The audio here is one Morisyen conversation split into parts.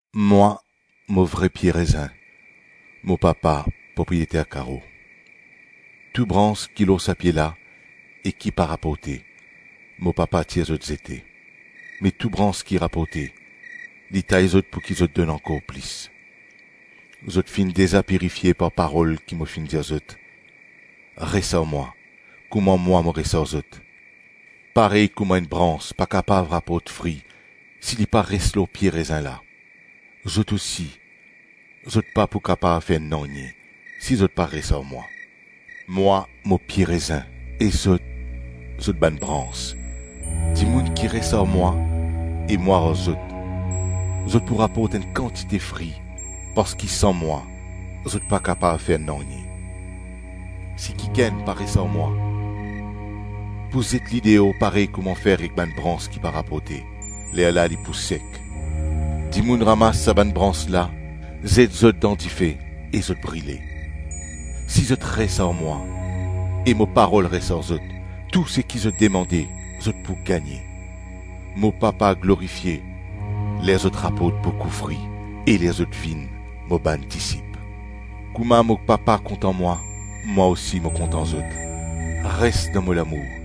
“Mwa, mo vre pie rezin, mo Papa, propriyeter karo. Tou brans ki lor sa pie la e ki pa raporte, mo Papa tir zot zete; me tou brans ki raporte, li tay zot pouki zot donn ankor plis. Zot finn deza pirifie par parol ki mo finn dir zot. Res ar mwa, kouma mwa mo res ar zot. Parey kouma enn brans pa kapav raport fri si li pa res lor pie rezin la, zot osi, zot pa pou kapav fer nanye si zot pa res ar mwa. Mwa, mo pie rezin e zot, zot bann brans. Dimoun ki res ar mwa e mwa ar zot, zot pou raport enn kantite fri parski san mwa zot pa kapav fer nanye. Si kikenn pa res ar mwa, pou zet li deor parey kouma fer ek enn brans ki pa raporte; lerla li pou sek. Dimoun ramas sa bann brans la, zet zot dan dife e zot brile. Si zot res ar mwa e mo parol res ar zot, tou seki zot demande zot pou gagne. Mo Papa glorifie, ler zot raport boukou fri e ler zot vinn mo bann disip. Kouma mo Papa kontan mwa, mwa osi mo kontan zot. Res dan mo lamour.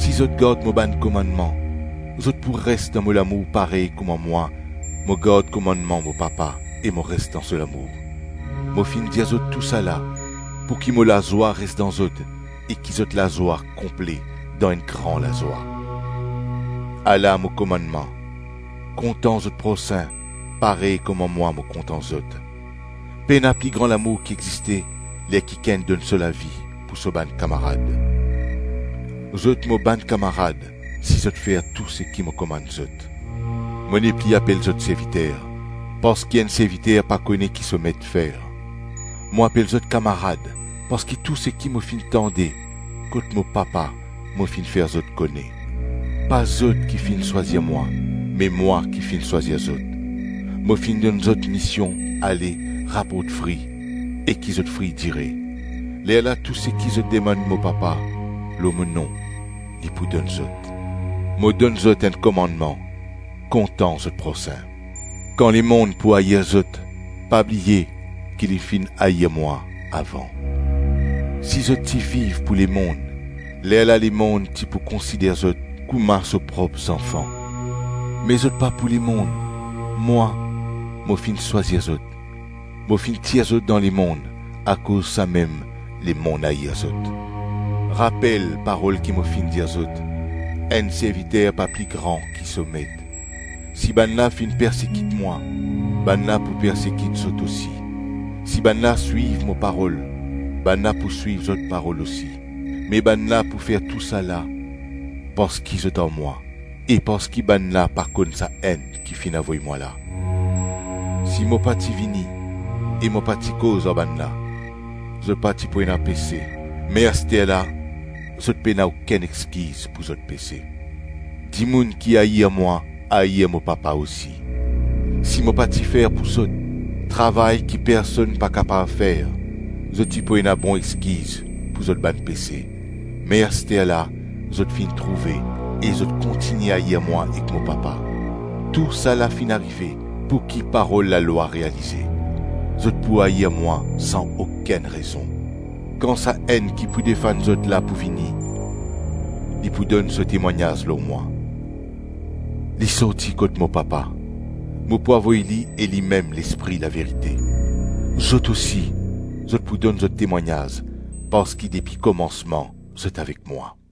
Si zot gard mo bann komannman, zot pou res dan mo lamour parey kouma mwa, mo gard komannman mo Papa e mo res dan so lamour. Mo finn dir zot tousala pouki mo lazwa res dan zot e ki zot lazwa konple dan enn gran lazwa. Ala mo komannman, kontan zot prosin, parey kouma mwa mo kontan zot. Pena pli gran lamour ki existe ler kikenn donn so lavi pou so bann kamarad. Zot mo bann kamarad si zot fer tou seki mo komann zot. Mo nepli apel zot serviter, parski enn serviter pa kone ki so met fer; mo apel zot kamarad, parski tou seki mo finn tande kot mo Papa, mo finn fer zot kone. Pa zot ki finn swazir mwa, me mwa ki finn swazir zot. Mo finn donn zot mision, ale, raport fri e ki zot fri dire. Lerla tou seki zot demann mo Papa lor mo nom, li pou donn zot. Mo donn zot enn komannman: kontan zot prosin. Kan lemonn pou air zot, pa bliye ki li finn air mwa avan. Si zot ti viv pou lemonn, lerla lemonn ti pou konsider zot kouma so prop zanfan; me zot pa pou lemonn; mwa, mo finn swazir zot, mo finn tir zot dan lemonn, akoz samem lemonn air zot. Rapel parol ki mo finn dir zot, ‘Enn serviter pa pli gran ki so met.’ Si bannla finn persekit mwa, bannla pou persekit zot osi. Si bannla swiv mo parol, bannla pou swiv zot parol osi. Me bannla pou fer tousala parski zot ar mwa e parski bannla pa konn Sa-Enn ki finn avoy mwa la. Si mo pa ti vini e mo pa ti koz ar bannla, zot pa ti pou ena pese me asterla zot pena okenn exkiz pou zot pese. Dimoun ki air mwa, air mo Papa osi. Si mo pa ti fer pou zot, travay ki personn pa kapav fer, zot ti pou ena bon exkiz pou zot bann pese; me asterla zot finn trouve e zot kontigne air mwa ek mo Papa. Tousala finn arive pouki parol lalwa realize, ‘Zot pou air mwa san okenn rezon.’ Kan Sa-Enn ki pou defann zot la pou vini, li pou donn so temwagnaz lor mwa. Li sorti kot mo Papa; mo pou avoy li e limem Lespri laverite. Zot osi zot pou donn zot temwagnaz parski depi komansman zot avek mwa.”